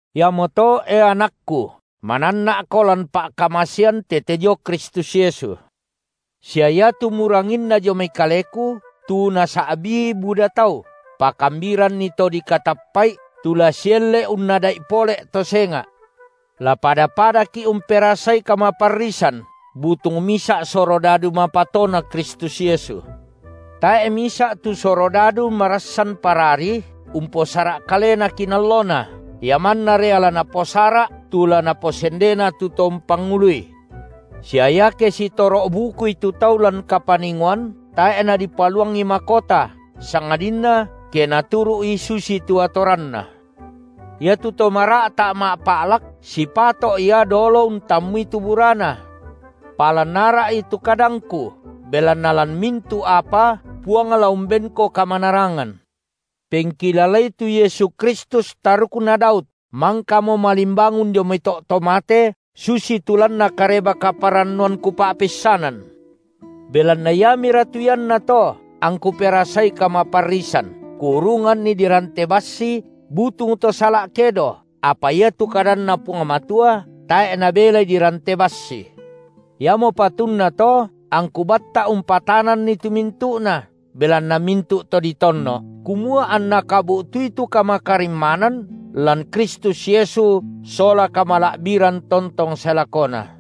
Iamoto, e anakku, mananna’ko lan pa’kamasean tete dio Kristus Yesu. Sia iatu muranginna dio mai kaleku, tu nasa’bii buda tau, pakambiranni to dikatappa’i, tu la sielle’ unnada’i pole’to senga’. La pada-padaki’ umperasai kamaparrisan, butung misa’ surodadu mapatoNa Kristus Yesu. Tae’ misa’ tu surodadu marassan parari, umposara’ kalena kinallona, ia manna ria la naposara’ tu la naposendena tu to umpangului. Sia iake sitoro’-bukui tu tau lan kapaningoan, tae’ nadipaluangi makota, sangadinna ke naturu’i susitu atoranna. Iatu to mara’ta’ ma’pa’lak, sipato’ ia dolo untammui tu burana. Palan ara’i tu kadangku, belanna lan mintu’ apa Puang la umbenko kamanarangan. Pengkilalai tu Yesu Kristus tarukna Daud, mangkamo malimbangun dio mai to’ to mate, susitu lanna Kareba-kaparannuan kupa’peissanan. Belanna iamira tu iannato angku perasai kamaparrisan, kuurunganni dirante bassi butung to sala’ kedo, apa iatu kadanNa Puang Matua tae’ nabelai dirante bassi. Iamo patunna to angku batta’ umpatananni tu mintu’na, belanna mintu’ to ditonno’, kumua anna kabu’tui tu kamakarimmanan, lan Kristus Yesu sola kamala’biran tontong sae lakona.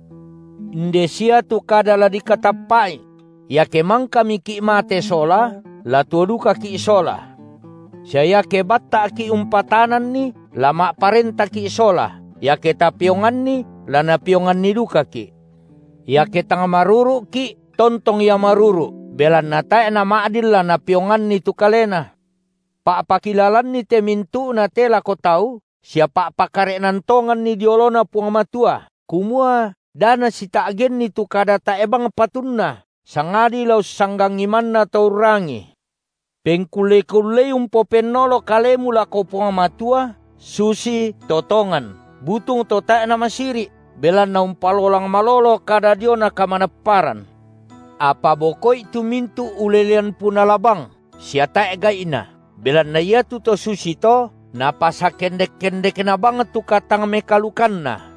Inde sia tu kada la dikatappa’i: Iake mangkamiki’ mate Sola, la tuo dukaki’ Sola; sia iake batta’ki’ umpatananni, la ma’parentaki’ Sola; iake tapeonganni, la Napeonganni dukaki’; iake tang maruru’ki, tontong Ia maruru’, belanna tae’ nama’din la Napeonganni tu Kalena. Pa’pakilalanni te mintu’na te lako tau, sia pa’pakare’nan tonganni dio oloNa Puang Matua, kumua da nasita’genni tu kada tae’ bang patunna, sangadi la ussanggangi manna to urrangii. Pengkulle-kullei umpopennolo kalemu lako Puang Matua susito tongan, butung to tae’ namasiri’, belanna umpalolang malolo kada diona kamanapparan. Apa boko’i tu mintu’ ulelean punala bang sia tae’ gai’na, belanna iatu to susito napasakendek-kendekna bang tu katang-mekaalukanna.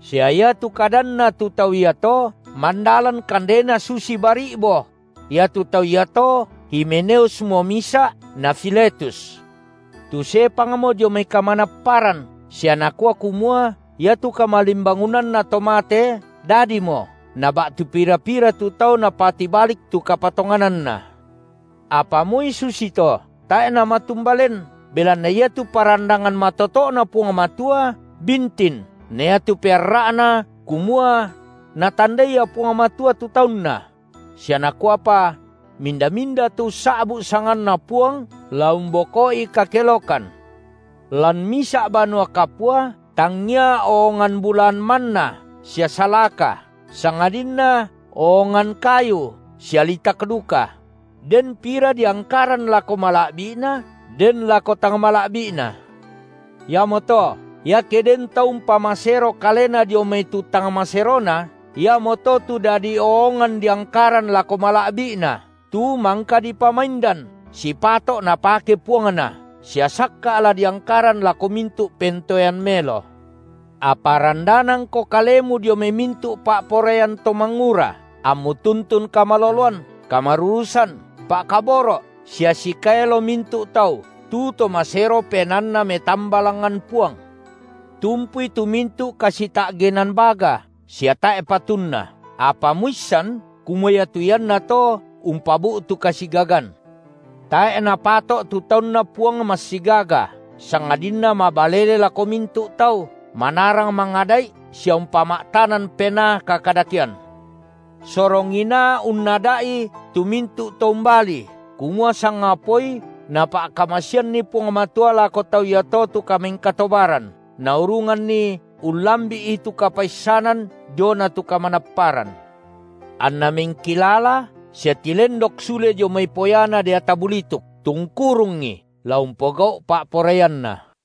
Sia iatu kadanna tu tau iato mandalan kandena susi bari’bo’; iatu tau iato Himeneusmo misa’ na Filetus, tu sepangmo dio mai kamanapparan, sia nakua kumua iatu kamalimbangunanna to mate dadimo, na ba’tu pira-pira tu tau napatibalik tu kapatongananna. Apa moi susito tae’ namatumba len, belanna iatu parandangan matoto’Na Puang Matua bintin, na iatu pearra’na, kumua: Natandai Ia Puang Matua tu taunNa; sia nakuapa: Minda-minda tu ussa’bu’ sanganNa Puang, la umboko’i kakelokan. Lan misa’ banua kapua tangia oongan bulaan manna sia salaka, sangadinna oongan kayu sia litak duka; den pira diangkaran lako mala’bi’na den lako tang mala’bi’na. Iamoto, iake den tau umpamasero kalena dio mai tu tang maserona, iamoto tu dadi oongan diangkaran lako mala’bi’na, tu mangka dipamaindan, sipato’ napake puangna, sia sakka’ la diangkaran lako mintu’ pentoean maelo. Apa randanangko kalemu dio mai mintu’ pa’poraian to mangura, ammu tuntun kamaloloan, kamarurusan, pa’kaboro’ sia sikaelo mintu’ tau, tu to masero penaanna metamba langngan Puang. Tumpui tu mintu’ kasita’genan baga sia tae’ patunna, apa muissan kumua iatu iannato umpabu’tu kasigagan. Tae’ napato’ tu taunNa Puang massigaga, sangadinna mabalele lako mintu’ tau, manarang mangada’i sia umpama’tanan penaa kakadakean; sorong inaa unnada’i tu mintu’ to umbalii, kumua sangapaoi Napa’kamaseanni Puang Matua lako tau iato tu kamengkatobaran, naurunganni ullambi’i tu kapaissanan diona tu kamanapparan, anna mengkilala sia tilendok sule dio mai poyana deata bulituk, tu ungkurungi, la umpogau’ pa’poraianna.